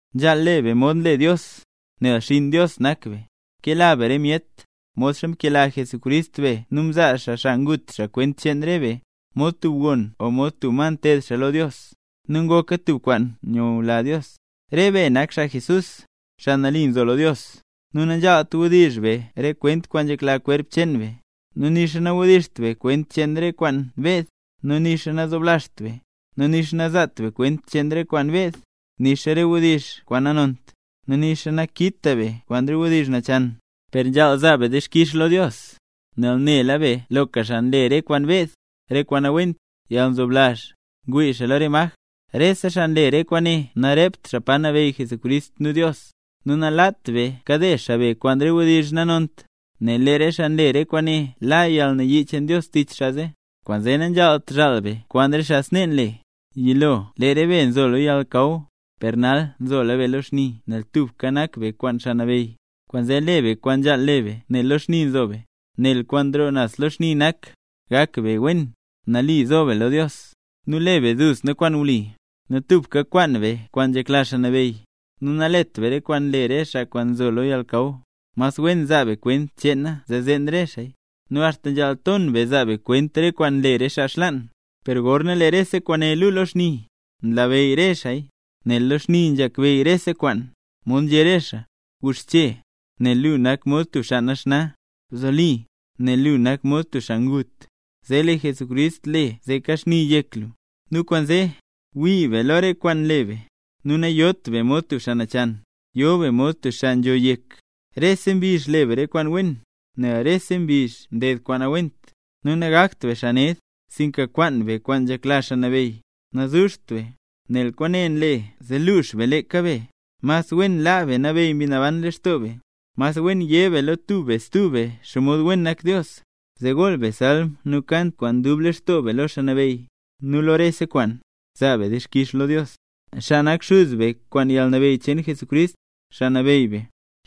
Nzhaal le be mod nle Dios, nel xinn Dios nak be. Kela be re myet, modxa mkela Jesucrist be nu mzaa xaa xaa ngut xaa kwent cheen re be, mod tub gon o mod tub ma nteed xaa lo Dios, nu ngoka tub kwaan nyula Dios. Re be nak xaa Jesús, xaa nambey, nu nanzhaalt: wdizh be re kwent kwaan nzhekla kwerp cheen be, nu nixa nawdizht be kwent cheen re kwaan beed, nu nixa nazoblazht be. Nu nixa nazaat be kwent cheen re kwaan beed, nixa re wdizh kwaan nanont, nixa nakita be kwaan re wdizh nachan; per nzhaal zaa be dixkix lo Dios. Nel nela be loka xaa nle: re kwaan beed, re kwaan nawent, yalnzoblazh, ngwii xaa lo re maj, rese xaa nle re kwaane narept xaa Pa Nabeyy Jesucrist nu Dios. Nu nalaat be kade xaa be kwaan re wdizh kwaan nanont, nel lee re xaa nle re kwaane la yalnayii cheen Dios tich xaa zee. Kwaanzee nanzhaalt zhaal be kwaan re xaa snee nle. Yilo lee re be nzo lo yalnakaw, per nal nzola be lo xni nel tubka nak be kwaan Xaa Nabeyy, kwaanzee le be kwaan nzhaal le be nel lo xni nzo be, nel kwaan nroo naz lo xni nak: gak be wen, nali zo be lo Dios, nu le be duzna kwaan wli. Nu tubka kwaan be kwaan nzhekla Xaa Nabeyy. Nu nalet be re kwaan nle re xaa kwaan nzo lo yalnakaw, mas wen zaa be kwent cheena zee zeen re xaaya. Nu axta nzhaal ton be zaa be kwent re kwaan nle re xaa xlaan; per gorna lee rese kwaane lu lo xni, nlabeyy re xaaya, nel lo xni nzhakbeyy rese kwaan, mod nzhé re xaa: Guxche, nel lu nak mod tub xaa naxna, bzoli, nel lu nak mod tub xaa ngut, zee lee Jesucrist le zee kaxni yek lu. Nu kwaanzee, wii be lo re kwaan nle be, nu nayot be mod tub xaa nachan, yo be mod tub xaa nzho yek. Rese mbizh le be re kwaan wen, nel rese mbizh ne ded kwaan nawent. Nu nagakt be xaa ned, sinka kwaan be kwaan nzhekla Xaa Nabeyy. Nazuzht be, nel kwaane nle zee luux be leeka be, mas wen laa be nabeyy Mbi Naban lextoo be. Mas wen yé be lo tub be stub be xomod wen nak Dios, zee gool be salm nu kant kwaan dub lextoo be lo Xaa Nabeyy. Nu lo rese kwaan, zaa be dixkix lo Dios, xaa nak Xuz be kwaan yalnabeyy cheen Jesucrist, Xaa Nabeyy be.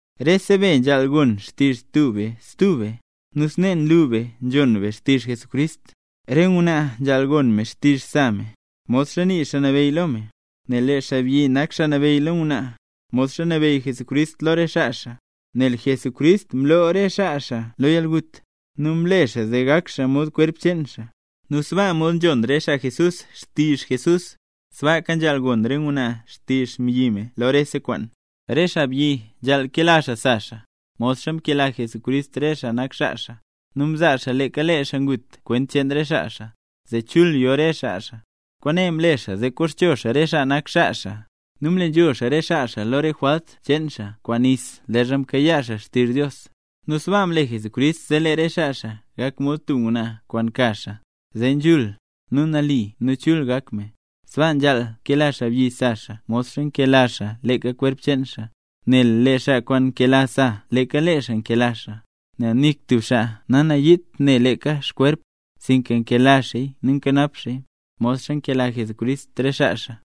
Rese be nzhaal gon xtizh tub be stub be, nu snee nlu be nzhon be xtizh Jesucrist. Re ngwnaa nzhaal gon me xtizh sa me, modxa nii Xaa Nabeyy lo me. Nel lee xaabyi nak xaa nabeyy lo ngwnaa, modxa nabeyy Jesucrist lo re xaa xaa, nel Jesucrist mloo re xaa xaa lo yalgut, nu mle xaa zee gak xaa mod kwerp cheen xaa. Nu sbaa mod nzhon re xaa Jesús xtizh Jesús, sbaaka nzhaal gon ngwnaa xtizh xmbyi me lo rese kwaan. Re xaabyi nzhaal kela xaa sa xaa, modxa mkela Jesucrist re xaa nak xaa xaa, nu mzaa xaa leeka lee xaa ngut kwent cheen re xaa xaa, zee chul yo re xaa xaa. Kwaane mle xaa zee koxcho xaa re xaa nak xaa xaa, nu mle nzhul xaa re xaa xaa lo re jwalt cheen xaa kwaan nis leezha mkayaa xaa xtizh Dios. Nu sbaa mle Jesucrist zee lee re xaa xaa gak mod tub ngwnaa kwaan ka xaa; zee nzhul, nu nali nu chul gak me. Sbaaka nzhaal kela xaabyi sa xaa modxa nkela xaa leeka kwerp cheen xaa, nel lee xaa kwaan nkela sa leeka lee xaa nkela xaa. Nel nik tub xaa nanayiit ne leeka xkwerp, sinka nkela xaaya nu nkanap xaaya, modxa nkela Jesucrist re xaa xaa,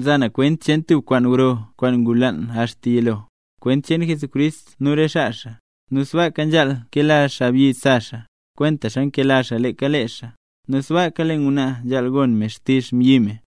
Mza na kwent cheen tub kwaan gro kwaan ngulaan axta yilo, kwent cheen Jesucrist nu re xaa xaa. Nu sbaaka nzhaal kela xaabyi sa xaa, kwentaxa nkela xaa leeka lee xaa, nu sbaaka lee ngwnaa nzhaal gon me xtizh xaabyi me.